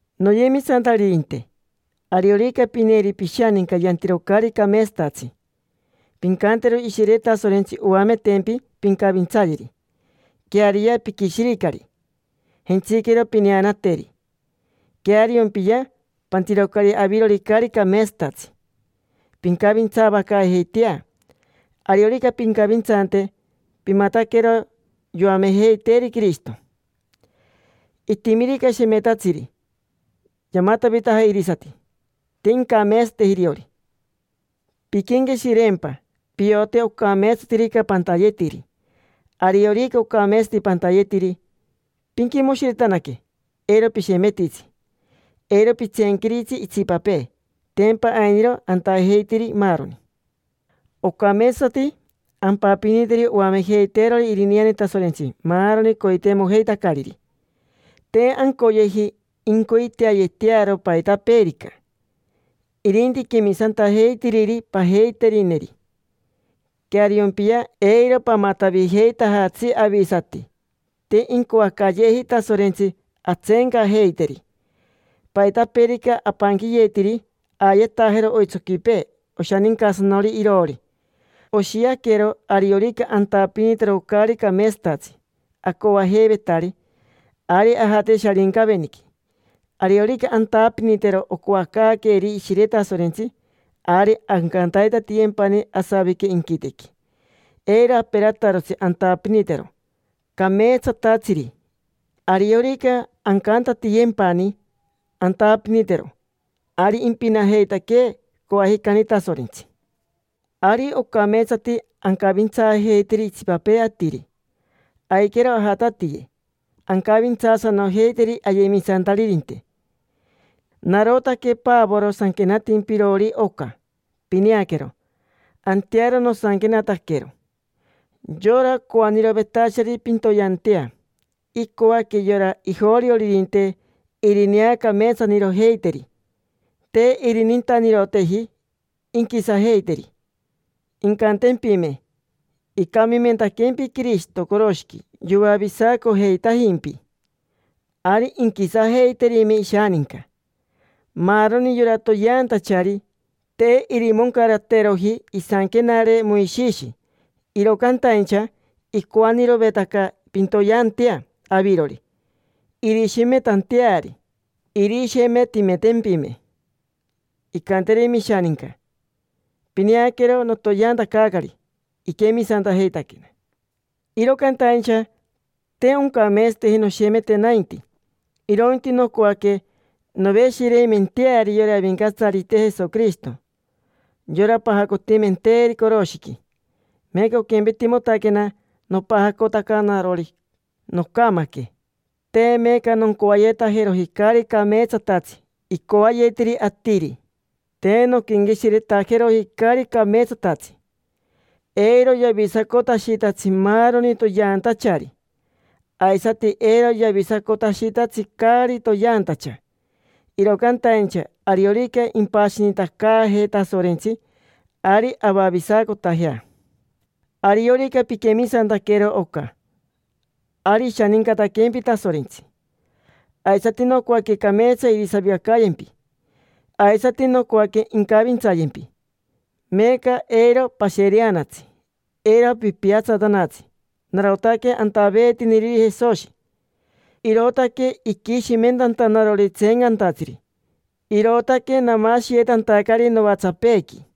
Noyemisantaririnte, ariorica pineeri pishaninca yantiro caari cameetsatatsi, pincantero Ishire Tasorentsi oametempi pincavintsayeri. Queariya, piquishiricari, jentsiquero pineanateri. Queariompiya pantirocari avirori caari cameetsatatsi. Pincavintsaavacaajeitea. Ariorica pincavintsante, pimataquero yoamejeiteeri Quirishito. Itimirica shemetatsiri, yamatavitaja irisati. Te incameetsateji iriori. Pinquenqueshireempa: piote ocameetsatirica pantayetiri. Ariorica ocameetsati pantayetiri, pinquimoshiretanaque. Eiro pishemetitsi, eiro pitseenquiritsi itsipapee, tempa ainiro antajeitiri maaroni. Ocameetsati ampapiniteri oamejeiteerori irineane Tasorentsi maaroni coiteimojeitacariri. Te ancoyeji incoiteayetearo paitapeerica. Irinti quemisantajeitiriri pajeiterineri. Queariompiya, eiro pamatavijeitajatsi avisati, te incoacayeeji Tasorentsi antseencajeiteri. Paitapeerica apanquiyetiri, aayetajero oitsoquipee oshanincasanori iroori. Oshiaquero ariorica antapinitero caari cameetsatatsi acoajeivetari, ari ajate Sharincaveniqui. Ariorica antapinitero ocoacaaqueeri Ishire Tasorentsi, ari ancantaitatiyempani asavique inquitequi. Eiro aperatarotsi antapinitero cameetsatatsiri. Ariorica ancantatiyempani antapinitero, ari impinajeitaquee coajicani Tasorentsi. Ari ocameetsati ancavintsaajeiteri itsipapee atiri, aiquero ajatatiye ancavintsaasanojeiteri ayemisantaririnte. Narotaque Pavoro sanquenatimpirori oca: pineaquero, antearo nosanquenataquero. Yora coanirovetachari pintoyeantea, icoaque yora ijorioririnte irineacameetsanirojeiteri. Te irinintaniroteji inquisajeiteri. Incantempime: “Icamimentaquempi Quirishito coroshiqui yoavisacojeitajimpi”, ari inquisajeiterime ishaninca. Maaroni yora toyeantachari te irimoncarateroji isanquenare Moishishi, iro cantaincha icoanirovetaca pintoyeantea avirori irishemetanteari. Irishemetimentempime, incanterime ishaninca: “Pineaquero, notoyeantacaacari. Iquemisantajeitaquena”. Iro cantaincha te oncameetsateji noshemete nainti, irointi nocoaque noveshireimenteari yora Avincatsarite Jesoquirishito: yora pajacotimenteeri coroshiqui. Meeca oquempetimotaquena nopajacotaca narori. Nocamaque, te meeca noncoayetajeroji caari cameetsatatsi icoayetiri atiri, te nonquenqueshiretajeroji caari cameetsatatsi. Eiro yavisacotashitatsi maaroni toyeantachari, aisati eiro yavisacotashitatsi caari toyeantacha. Iro cantaincha ariorica impashinitacaajee Tasorentsi, ari avavisacotajea. Ariorica piquemisantaquero oca, ari ishanincataquempi Tasorentsi, aisati nocoaque cameetsa irisavicacayempi, aisati nocoaque incavintsayempi. Meeca eiro pashereanatsi, eiro pipiatsatanatsi. Narotaque antaveetiniriri Jesoshi, irootaque iquishimentantanarori tseencantatsiri, irootaque namashiyetantacari novatsapeequi.